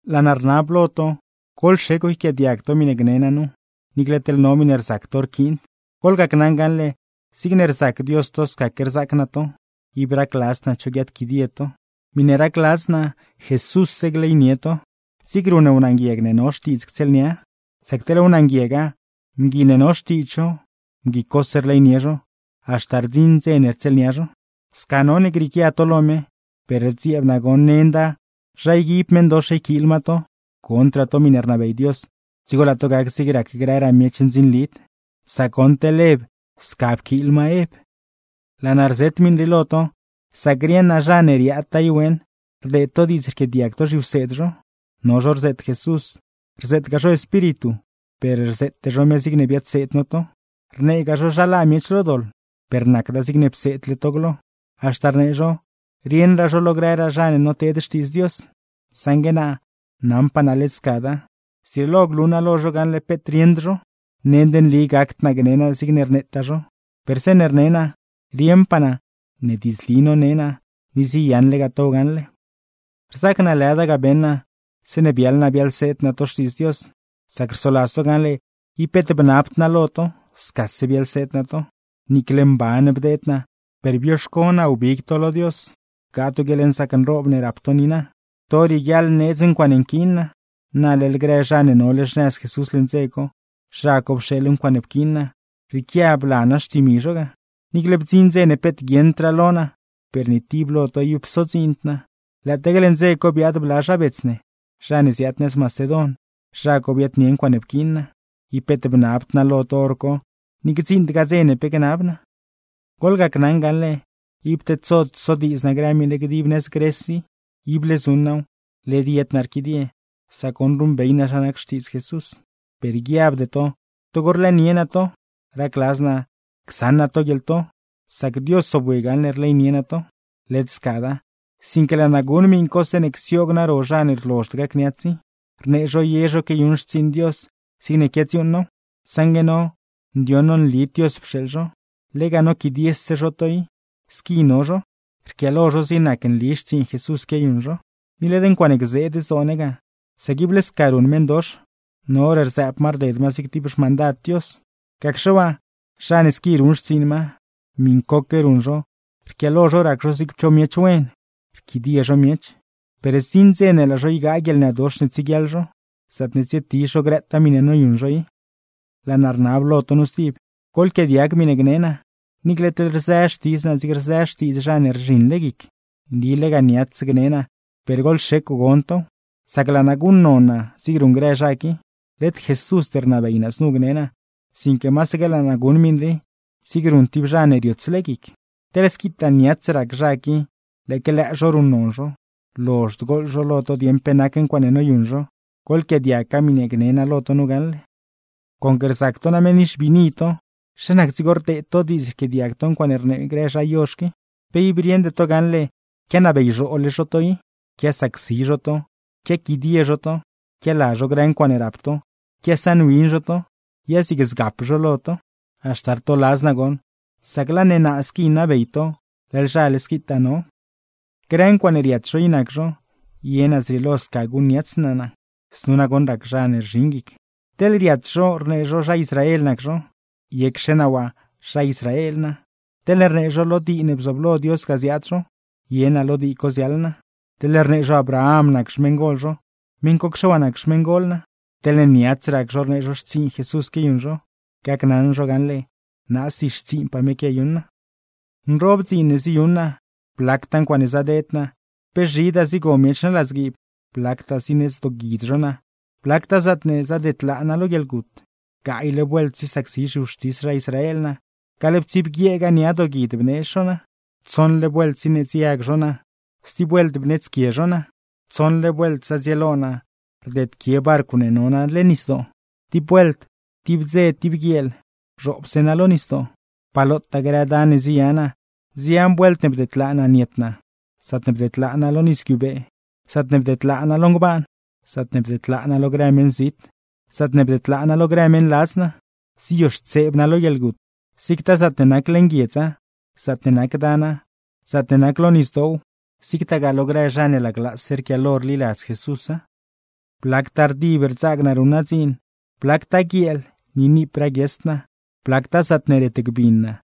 Laa naa rnab lo to, ¡goḻxecw yquiaadiag to miṉe gne naa nu, niicle teḻ no miṉe rzac to rquiind! Goḻgacnaṉ gaṉle, zigne rzac Dios to scaque rzaac naa to, ib racladzd naa cho guiaadquidie to. Miṉe racladz naa Jesússe gleynie to, zig ruṉ wnaa nguieg ne no xtiidz ctsieelnia. Sac teḻ wnaa nguiega, mgui ne no xtiidz zho mgui cose rleynie zho, haxta rdziṉ dze ne rtsieelnia zho. Sca none grieequia to lo me; per rdzieeb naa goṉ nend zha yguib meṉdox yquiil ma to, gondraa to miṉe rnabey Dios, dzigo laa to gac zig rac grëraa miech ndzinlid. Sac goṉ teḻ Ev, sca pquiil ma Ev. Laa naa rzet miṉ rii lo to, sac rieṉ naa, zha ne riaadtaa i weeṉ rdeed to diidz rquiaadiag to zhiwseed zho. No zho rzeet Jesús, rzeetgaa zho espíritu, per rzeete zho me zigne biadseed no to; rneegaa zho zha laa miech lo doḻ, per nacda zigne pseedle to glo. Haxta rnee zho, rieṉraa zho lo grëraa zha ne noteed Xtiidz Dios; saṉgue naa, naṉpaa naa led scada, zrieelo glu naa lo zho gaṉle peet rieṉd zho. Nend nli gacd naa gne naa zigne rneetaa zho, per zeeṉe rne naa rieṉpaa naa ne diidzli none naa; ni ziyaṉlegaa tow gaṉle. Rzaac naa lëda ga beṉ naa, zeeṉe biaḻ naa biaḻseed naa to Xtiidz Dios; sac rsoladz to gaṉle ib peet bnabd naa lo to, scase biaḻseed naa to. Niicle mban bdeed naa, per bioxco naa wbig to lo Dios bgaa to guieḻnzaac nroob ne rap to niina. To rieguiaḻ needz ncuaaṉe nquiin naa, na leḻ grë zha ne nole xnëz Jesús leṉ dze co, zha co pxeeḻ ncuaaṉe pquiin naa, rrieequia bla naa xtimi zho ga. Niicle bdziṉ dze ne peet guieṉdraa lo naa, per ni tib lo to ib psodziind naa; lëëtaque leṉ dze co biaad bla zha bets ne zha ne ziaad nëz Macedon, zha co biaadnie ncuaaṉe pquiin naa. Ib peet bnabd naa lo to hor co, ni gdziṉdgaa dze ne pe gnab naa. Ni goḻgacnaṉ gaṉle, ib tedsod sodiidz naa grë miṉ rii dib nëz Gres i. Ible zuṉ naaw, led yed naa rquidie, sac goṉ ruṉbey naa zha nac Xtiidz Jesús. Per guiabde to togo rlëënie naa to, racladz naa csaṉ naa to guieḻto; sac Dios zobwi gaṉle rleynie naa to. Goḻgacnaṉ sca led scada, sinque laa naa guṉ miṉ co, zeeṉa csioog naa ro zha ne rlozhd gacniats i, rnee zho ye zho quiayuṉ xtsiiṉ Dios zigne quiadziuuṉ now. Saṉgue no, ndioṉ no nlid Dios pxeeḻ zho, lega noquidiese zho to i squi no zho, rquiaalo zho zig nacne nli xtsiiṉ Jesús quiayuṉ zho. Ni led ncuaaṉe gzeed zdoo ne ga. Sac ible sca ruṉ meṉdox, no hor rzëëb ma rded ma zig tib xmandad Dios. Gacxe waa, ¡zha ne squi ruṉ xtsiiṉ ma, miṉcoque ruṉ zho rquiaalo zho rac zho zig cho miech wen, rquidie zho miech! Per zdziṉ dze ne laa zho ygaa guieḻnëdox ne tsieguiaḻ zho, zaatne tsietizh zho grëtaa miṉe noyuṉ zho i. Laa naa rnab lo to nu stib, goḻquiaadiag miṉe gne naa, niicle teḻ rzë xtidz naa zig rzë xtiidz zha ne rzhiṉle guic. Nli lega niats gne naa, per goḻxecw gon tow, sac laa naa guṉnon naa zig ruṉ grë zha qui. Led Jesúsd rnabey znu gne naa, sinque masaque laa naa guṉ miṉ rii, zig ruṉ tib zha ne riotsle guic. Teḻ squitaa niats rac zha qui lëëque lëë zho ruṉnon zho, lozhd gooḻ zho lo to dieṉ pe nac ncuaaṉe noyuṉ zho; goḻquiaadiaggaa miṉe gne naa nu na gaṉle: Conque rzac to name nixbiini to, ¿zha nac dzigo rdeed to diidz rquiaadiag to ncuaaṉe rnee grë zha yozh qui? ¿Pe ib rieṉde to gaṉle quianabeyzhoole zho to i, quiasacsi zho to, quiaquidie zho to, quiala zho grë ncuaaṉe rap to, quiasaṉwin zho to, ya zig zgap zho lo to? ¡Haxta rtoladz naa goṉ, sac laa ne naa squi nabey to leḻ zhale squitaa no! Grë ncuaaṉe riats zho i nac zho, ye naa zrieelo sca guṉniats naa naa (znu nagoṉ rac zha ne rzhiṉ guic). ¿Teḻne riats zho rnee zho zha Israel nac zho? Yecxe naa waa zha Israel nac naa. ¿Teḻne rnee zho lo dii ne bzooblo Dios ga ziaad zho? Ye naa lo dii co ziaḻ naa. ¿Teḻne rnee zho Abraham nac xmeṉgol zho? Meṉ cocxe waa nac xmeṉgol naa. ¿Teḻne niats rac zho rnee zho xtsiiṉ Jesús quiayuṉ zho? Gacnaṉ zho gaṉle, naasi xtsiiṉpaa me quiayuṉ naa. Nroob dziin ne ziyuṉ naa, blactaa ncuaaṉe zadeed naa, pe zhidaa zigo miech naa ladzguiib, blactaa zineedz dooguid zho naa, blactaa zaatne zadedlaa naa lo guieḻgut. Gaayle vuelt zisacsi zhiwxtis zha Israel naa, gaḻptsibguieega nia dooguid bneedz zho naa. Tsoṉle vuelt zineedzyag zho naa, stib vuelt bneedzquie zho naa. Tsoṉle vuelt zadzieelo naa rdedquie barcw ne no naa leṉ nisdoo; tib vuelt, tib dze tib guieel bzhoobse naa lo nisdoo. Pa lotaa grë dan ne ziya naa. Nzian vuelt ne bdedlaa naa niet naa: zaatne bdedlaa naa lo nis guiubee, zaatne bdedlaa naa lo ngbaan, zaatne bdedlaa naa lo grë meṉzit, zaatne bdedlaa naa lo grë meṉladz naa. Ziyoxtseeb naa lo guieḻgut, zigtaa zaatne nac leṉ guiedza, zaatne nac dana, zaatne nac lo nisdoow, zigtagaa lo grë zha ne laglaase rquiaalo rliladz Jesúsa. Blactaa rdib rdzaag naa ruṉ naa dziin, blactaa guieel ni niip raaguiesd naa, blactaa zaatne retgbin naa,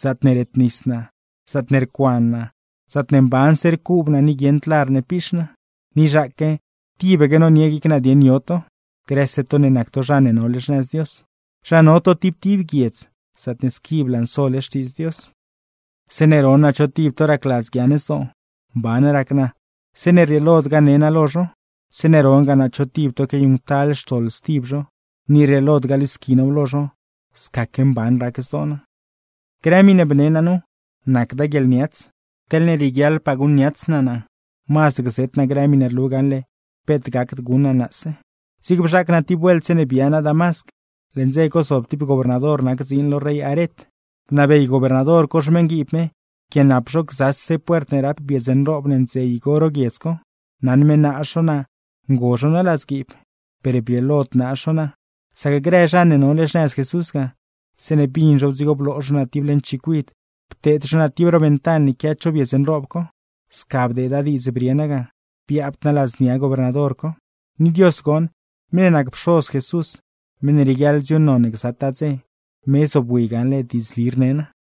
zaatne retnis naa, zaatne rcuan naa, zaatne mbanse rcuub naa ni guieṉd lar ne piix naa. Ni zhaaque tibaque nonie guic naa dieṉ yo to, grëse to ne nac to zha ne nole xnëz Dios, zha no to tib tib guiedz zaatne squi blansole Xtiidz Dios. Zeeṉe ron naa cho tib to racladz guiaaṉ zdoo, mban rac naa zeeṉe rrieelod gane naa lo zho; zeeṉe rongaa naa cho tib to quiayuṉctal xtoḻ stib zho, ni rrieelod galisqui naaw lo zho, scaque mban rac zdoo naa. Grë miṉe bne naa nu, nacda guieḻniats; teḻne rieguiaḻpaa guṉniats naa naa, mazd gzet naa grë miṉe rlu gaṉle peet gacd guṉ naa naase. Zig bzhaac naa tib vuelt zeeṉe bia naa Damasc, leṉ dze co zob tib gobernador nac dziin lo rey Aret. Bnabey gobernador co xmeṉguiib me pquianap zho gzase puert ne rap biedz nroob ne ndze igo ro guiedz co; naṉ me naaz zho naa ngo zho naa ladzguiib. Per brieelod naaz zho naa, sac grë zha ne nole xnëz Jesús ga, zeeṉe bin zhow dzigo bloo zho naa tib leṉ chicuid pteed zho naa tib ro ventan ne quia cho biedz nroob co. Sca bdeeda diidz brie naa ga, biabd naa ladznia gobernador co. Ni Dios goṉ, meṉ ne nac Pxoz Jesús, meṉ ne rieguiaḻ dziuuṉnon ne gzataa dze, me zobwi gaṉle diidzli rne naa.